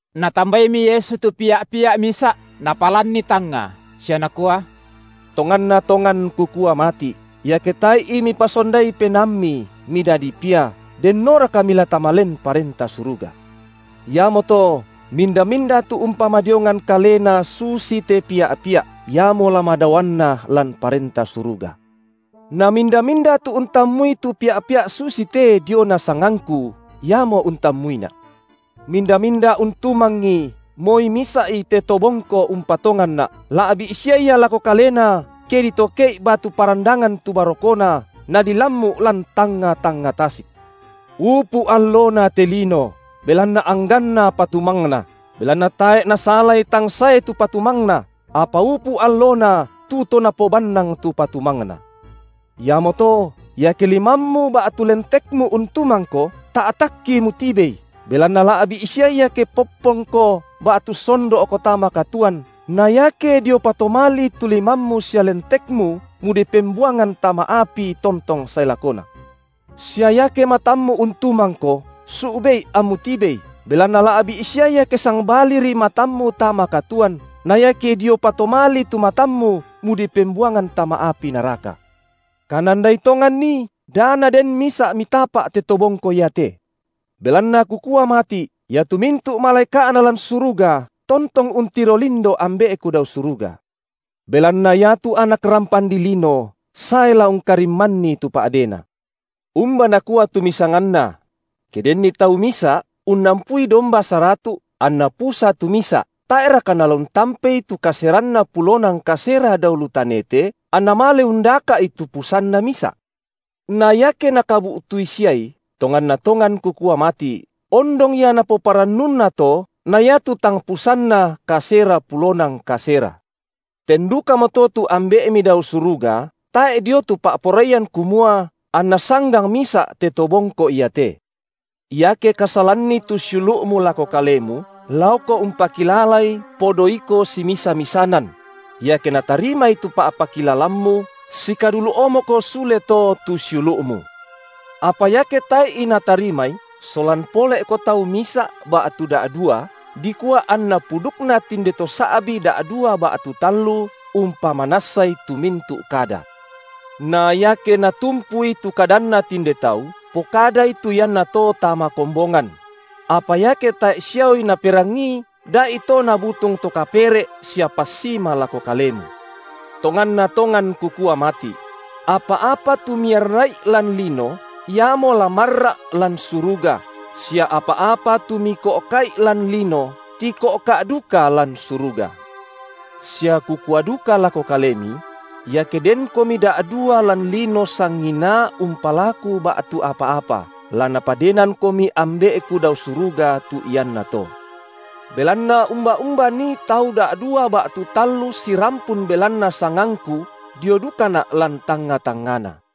Natambaimi Yesu tu pia’-pia’ misa’ Napalanni tangnga, sia Nakua: Tonganna tongan Kukua mati’, iake tae’i mipasondai penaammi, midadi pia, dennoraka mila tama len Parenta Suruga? Iamoto, minda-minda tu umpamadiongan kalena susite pia’-pia’, iamo la madaoanna lan Parenta Suruga. Na minda-minda tu untammui tu pia’-pia’ susite diona sangangKu, iamo untammuiNa’. Minda-minda untumangi moi misa’i te to bongko umpatonganNa’, la’bi’ sia ia lako kalena ke ditoke’i batu parandangan tu barokona, nadilammu’ lan tangnga-tangnga tasik. Upu’ allona te lino, belanna angganna patumangna. Belanna tae’ nasalai tang sae tu patumangna, apa upu’ allona tu to napobannang tu patumangna. Iamoto, iake limammu ba’tu lentekmu untumangko, ta’takki mutibei, belanna la’bi’ sia ia ke popponko ba’tu sondo’ko tama katuoan na iake dio patomalii tu limammu sia lentekmu mudipembuangan tama api tontong sae lakona. Sia iake matammu untumangko, su’be’i ammu tibei, belanna la’bi’ sia ia ke sangbaliri matammu tama katuoan, na iake dio patomalii tu matammu mudipembuangan tama api naraka. Kanandai tonganni, da naden misa’ mitapa’ te to bongko iate. Belanna Kukua mati’, iatu mintu’ malaeka’na lan suruga tontong untiro lindo Ambe’Ku dao suruga. (Belanna iatu Anak rampan dilino sae la ungkarimmanni tu pa’dena.) Umba nakua tu misanganna? Ke denni tau misa’ unnampui domba saratu’, anna pusa tu misa’, tae’raka nala untampei tu kaseranna pulona ngkasera dao lu tanete, anna male undaka’i tu pusanna misa’? Na iake nakabu’tui siai, tonganna tongan Kukua mati’, ondong ia napoparannunna to na iatu tang pusanna kasera pulona ngkasera. Ten dukamoto tu Ambe’mi dao suruga tae’ dio tu pa’poraian kumua anna sanggang misa’ te to bongko iate. Iake kasalanni tu siulu’mu lako kalemu, laoko umpakilalai podo iko simisa-misanan; iake natarimai tu pa’pakilalammu, sikadulu’ omoko sule to tu siulu’mu. Apa iake tae’i natarimai, solan pole’ko tau misa’ ba’tu da’dua dikua anna pudukna tinde to sa’bi’ da’dua ba’tu tallu umpamanassai tu mintu’ kada. Na iake natumpui tu kadanna tinde tau, pokadai tu iannato tama kombongan; apa iake tae’ siaoi naperangii da’ito nabutung to kapere’ sia passima lako kalemu. Tonganna tongan Kukua mati’: apa-apa tu miarra’i lan lino, iamo la maarra’ lan suruga, sia apa-apa tu miko’ka’i lan lino, tiko’ka’ duka lan suruga. Sia Kukua duka lako kalemi: Iake denkomi da’dua lan lino sanginaa umpalaku ba’tu apa-apa, la Napadenangkomi Ambe’Ku dao suruga tu iannato. Belanna umba-umba nii tau da’dua ba’tu tallu sirampun belanna sangangKu, dio dukaNa’ lan tangnga- tangngana.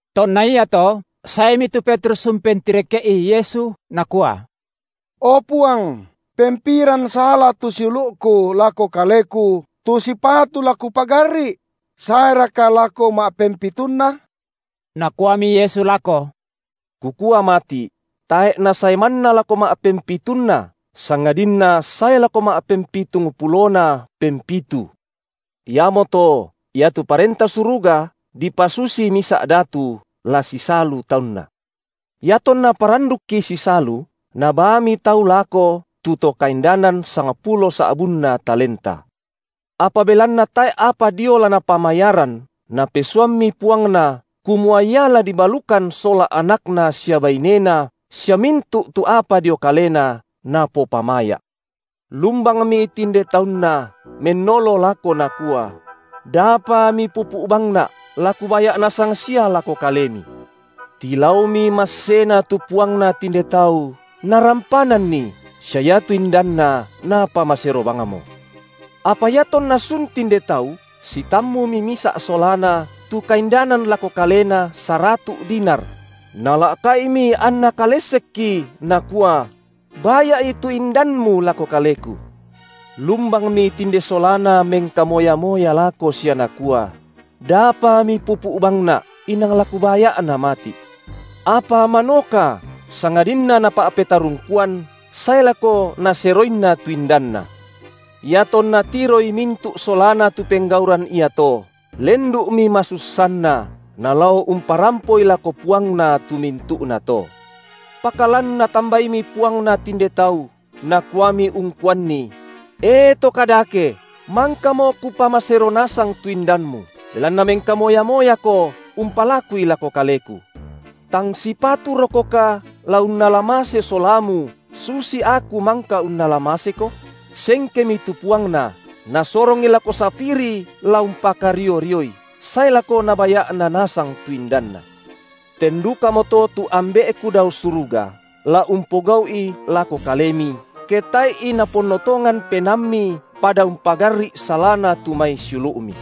Tonna iato saemi tu Petrus umpentireke’i Yesu nakua: O Puang, pempiran sala tu siulu’ku lako kaleku tu sipatu la kupagarri’? Saeraka lako ma’pem- pitunna? Nakuami Yesu lako: Kukua mati’: tae’ nasae manna lako ma’pempitunna, sangadinna sae lako ma’pempitungpulona pempitu. Iamoto iatu Parenta Suruga dipasusi misa’ datu, la sisalu taunna. Iatonna parandukki sisalu, nabaami tau lako tu to kaindanan sangpulo sa’bunna talenta. Apa belanna tae’ apa dio la napamayaran, napesuammi puangna, kumua ia la dibalukan sola anakna sia bainena, sia mintu’ tu apa dio kalena, napopamaya’. Lumbangmi tinde taunna, mennolo lako, nakua: Dapa mipupu’ bangna’ la kubaya’ nasang sia lako kalemi. Tilaomi massena tu puangna tinde tau, narampananni, sia iatu indanna napamasero bangmo. Apa iatonna sun tinde tau, sitammumi misa’ solana, tu kaindanan lako kalena saratu’ dinar; nala’ka’imi anna kalessekki, nakua: Baya’i tu indanmu lako kaleku. Lumbangmi tinde solana mengkamoya-moya lako sia nakua: dapa mipupu’ bangna’, inang la kubaya’na mati’. Apa manoka, sangadinna napa’petarungkuan, sae lako naseroinna tu indanna. Iatonna tiroi mintu’ solana tu penggauran iato, lendu’mi masussanna, nalao umparampoi lako puangna tu mintu’nato. Pakalan natambaimi puangna tinde tau, nakuami ungkuanni: E to kadake, mangkamo kupamasero nasang tu indanmu, belanna mengkamoya-moyako umpalakui lako kaleku. Tang sipaturokoka la unnala mase solamu susi aku mangka unnala maseko? Sengkemi tu puangna, nasorongi lako sapiri la umpakario-rioi, sae lako nabaya’na nasang tu indanna. Ten dukamoto tu Ambe’Ku dao suruga la umpogau’i lako kalemi, ke tae’i naponno tongan penaammi pada umpagarri’ salana tu mai siulu’mi.